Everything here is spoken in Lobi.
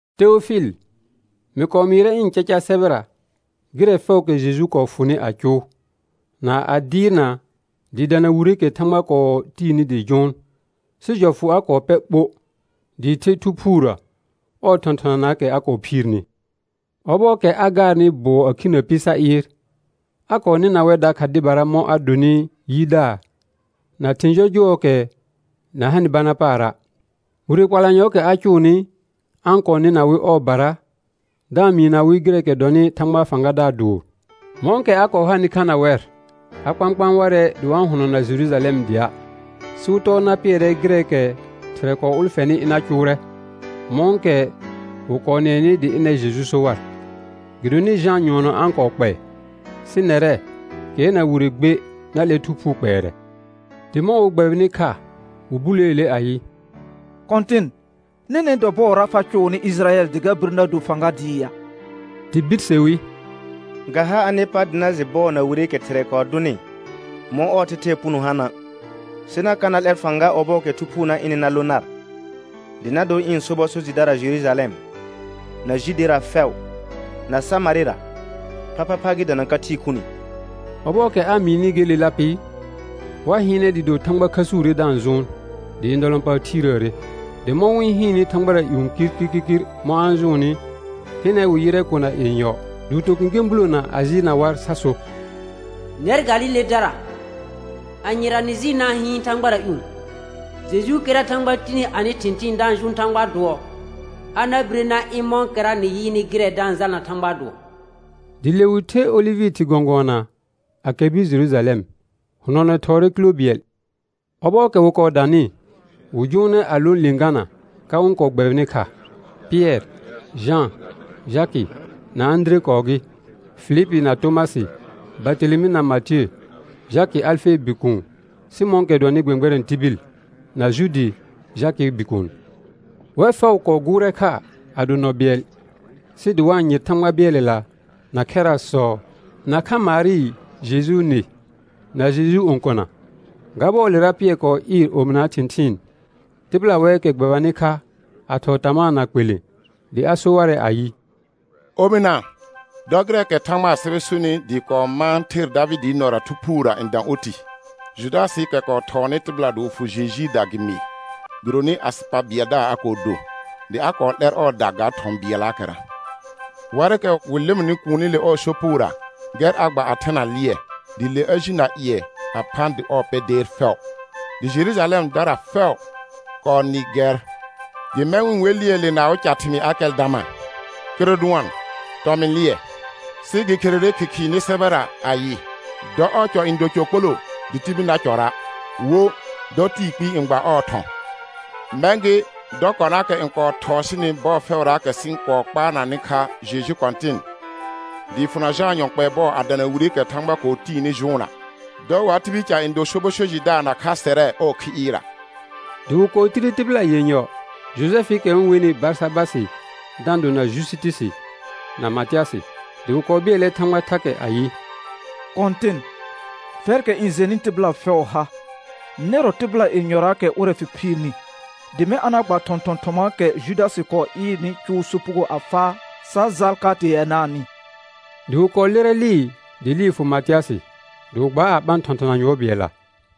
Teofɩl, mɩ kɔɔ mɩɩrɛ ɩ̃ caca sɛbɛra gɩrɛ fɛʋʋkɛ Jeju kɔɔ fʋnɩ a cʋʋ, na a dɩɩrna dɩɩ dana wireekɛ Thãgba kɔɔ tiini dɩ jʋʋn; sɩ jɔfʋ a kɔɔ pɛr ɓo dɩɩ the Thu Phuurə ɔɔ thɔ̃thɔnanaakɛ a kɔɔ phiirni. Ɔbɔɔkɛ a gaarnɩ bʋɔ a khinə pɩ sa ɩɩr, a kɔɔ nɩna wɛr dakha dɩbara mɔ̃ a donɩ yidaar na thɩ̃ jɔjʋɔɔkɛ na hanɩ bana paara'. Wire kpalanyɔɔkɛ a cʋʋnɩ, a-n kɔɔ nɩna wɩ ɔɔbara da-n mɩɩna wɩ gɩrɛ dɔnɩ Thãgbaa fãgadaar dʋʋr. Mɔ̃kɛ a kɔɔ hanɩ kha na wɛr a kpãkpãa warɛ dɩ wa-n hʋnɔna Jerujalɛm dɩa', sɩ wɩ tɔɔ na pɩɛrɛ gɩrɛɛkɛ Thɩrɛ kɔɔ ʋlfɛnɩ ɩna cʋʋrɛ mɔ̃kɛ wɩ kɔɔ nɩɛnɩ dɩ ɩnɛr Jeju so war. Gɩdonɩ Jã nyʋɔnɔ a-n kɔɔ kpɛɛ, sɩ nɛrɛ, kɩɛr na wire gbe na 'lɛr Thu Phuu kpɛɛrɛ. Dɩ mɔ̃ wɩ gbɛbɩnɩ kha wɩ buleele ayɩ: Kɔ̃tɩn, nɛnɛ̃ dɔ bɔɔra fa cʋʋnɩ Ɩjɩrayɛl dɩ ga bir na do fãga dɩɩ ya? Dɩ birse wi: Ga ha anɩ pa dɩ na jɩ bɔɔ na wireekɛ Thɩrɛ kɔɔ dʋnɩ mɔ̃ ɔɔ thɛthɛɛ puno hana'. Sɩ na ka na 'lɛr fãga ɔbɔɔkɛ Thu Phuu na ɩnɩ na lõ nar, dɩ na dor ɩ̃ sobɔ so jɩdara Jerujalɛm, na Judera fɛʋ, na Samarɩra phaphapha gɩ dana ka thɩɩ khuni. Ɔbɔɔkɛ a mɩɩnɩ gelela pɩ, wa hɩɩnɛ dɩɩ do Thãgba khəsuure da-n jʋʋn, dɩ ndɔlɔ̃paar thiirəəre. Dɩ mɔ̃ wɩ-n hɩɩnnɩ thãgbara ƴũ kirkirkir mɔ̃ a-n jʋʋnnɩ, hɩnɛ wɩ yɩrɛ kona yenyɔ dɩ wɩ to kẽkẽ bulona a jɩɩlna war sa so: Nɛr Galiledara, anyera nɩ jɩɩl na-n hɩɩn thãgbara ƴũ? Jejuukɛra Thãgba tini anɩ thɩ̃thɩɩn da-n jʋʋn Thãgbaa dʋɔ, a na bire na ɩ̃ mɔ̃kɛra nɩ yɩɩnɩ gɩrɛ da-n jalna Thãgbaa dʋɔ. Dɩ le wɩ the olɩvɩ thɩr gɔ̃gʋɔna a kɛr bir Jerujalɛm, hʋnɔnɛ thɔɔrɛ kilə bɩɛl. Ɔbɔɔkɛ wɩ kɔɔ danɩ, wɩ jʋʋnɛ a lõ lɩ̃gana ka wɩ-n kɔɔ gbɛbɩnɩ kha; Pɩɛr, Jã, Jakɩ na Ãdire kɔɔ gɩ, Filipi na Tomasɩ, Bartelemɩ na Matiə, Jakɩ Alfee bikuun, Sɩmɔ̃ɔkɛ dʋɔnnɩ gbɛ̃gbɛrɛ̃ tibil, na Juudi Jakɩɩ bikuun. Wɛr fɛʋ kɔɔ gʋʋrɛ kha a do nɔ bɩɛl, sɩ dɩ wa-n yɩr Thãgba bɩɛlɛla na khɛrasɔ, nakha Marɩ Jejuu nɩ, na Jejuu õkona. Ga bɔɔlera Pɩɛr kɔɔ ɩɩr omɩnaa thɩ̃thɩɩn, tɩbɩla wɛɛkɛ gbɛbanɩ kha a thɔɔ tamaa na kpelẽ, dɩ a so warɛ ayɩ: Omɩna, dɔ gɩrɛɛkɛ Thãgbaa sɛbɛ sonɩ dɩɩ kɔɔ mãa ther Davɩdɩɩ nɔra Thu Phuurə n dã oti, Judasɩɩkɛ kɔɔ thɔɔnɩ tɩbɩla dɩ wɩ fʋ Jejuuda gɩ mɩɩ. Gɩdonɩ asɩ pa bɩɛldaar a kɔɔ do, dɩ a kɔɔ 'lɛr ɔɔda ga thɔ̃ bɩɛllaakɛra. Warɩkɛ wɩ lɩmɩnɩ kuunile ɔɔ sopugora, gɛr a gba a thena lɩɛ, dɩ le a ji na ƴɩɛ a phã dɩ ɔɔ pɛ deer fɛʋ. Dɩ Jerujalɛmdara fɛʋ kɔɔ nɩ gɛr, dɩ mɛ̃ wɩ-n we lɩɛɛle na awɩ thɩmɩɩ Akɛldama, kɩrʋ dʋɔn: Tɔmɩ̃ lɩɛ. Sɩ gɩ kherere Khɩkhɩɩ nɩ sɛbɛra ayɩ: «Dɔ ɔɔ cɔ n do cɔ kpoloo, dɩ tibil na cɔrɔa'.» Wo: «Dɔ tɩɩ kpɩɩ n gba ɔɔ thɔ̃.» Mɛ̃ gɩ, dɔ konaakɛ n kɔɔ thɔɔ sɩnɩ bɔɔ fɛʋraakɛ sɩ-n kɔɔ kpaarnanɩ kha Jeju Kɔ̃tɩn, dɩɩ fʋna Jãa yɔ kpɛɛ bɔ a dana wireekɛ Thãgba kɔɔ tiini jʋʋnna, dɔ wa tibil ca n do sobɔ so jɩdaar nakha sɛrɛ ɔɔ khi ɩɩrra. Dɩ wɩ kɔɔ tire tɩbɩla yenyɔ, Jojɛfɩɩkɛ wɩ-n wenɩ Barsabasɩ da-n dona Jusitusi, na Matɩasɩ. Dɩ wɩ kɔɔ bɩɛlɛ Thãgba thakɛ ayɩ: Kɔ̃tɩn, fɛrkɛ n jɛnɩ tɩbɩla fɛʋʋ ha, nɛrɔ tɩbɩla yenyɔraakɛ ʋrɛ fɩ phiirni, dɩ mɛ̃ a na gba thɔ̃thɔn thɔmaakɛ Judasɩ kɔɔ ɩɩrnɩ cʋʋ sopugo a faa sa jal ka teanaanɩ. Dɩ wɩ kɔɔ lɩrɛ lɩɩ, dɩ lɩɩ fʋ Matɩasɩ dɩ wɩ gbaa a ɓã thɔ̃thɔna yʋɔr bɩɛlla.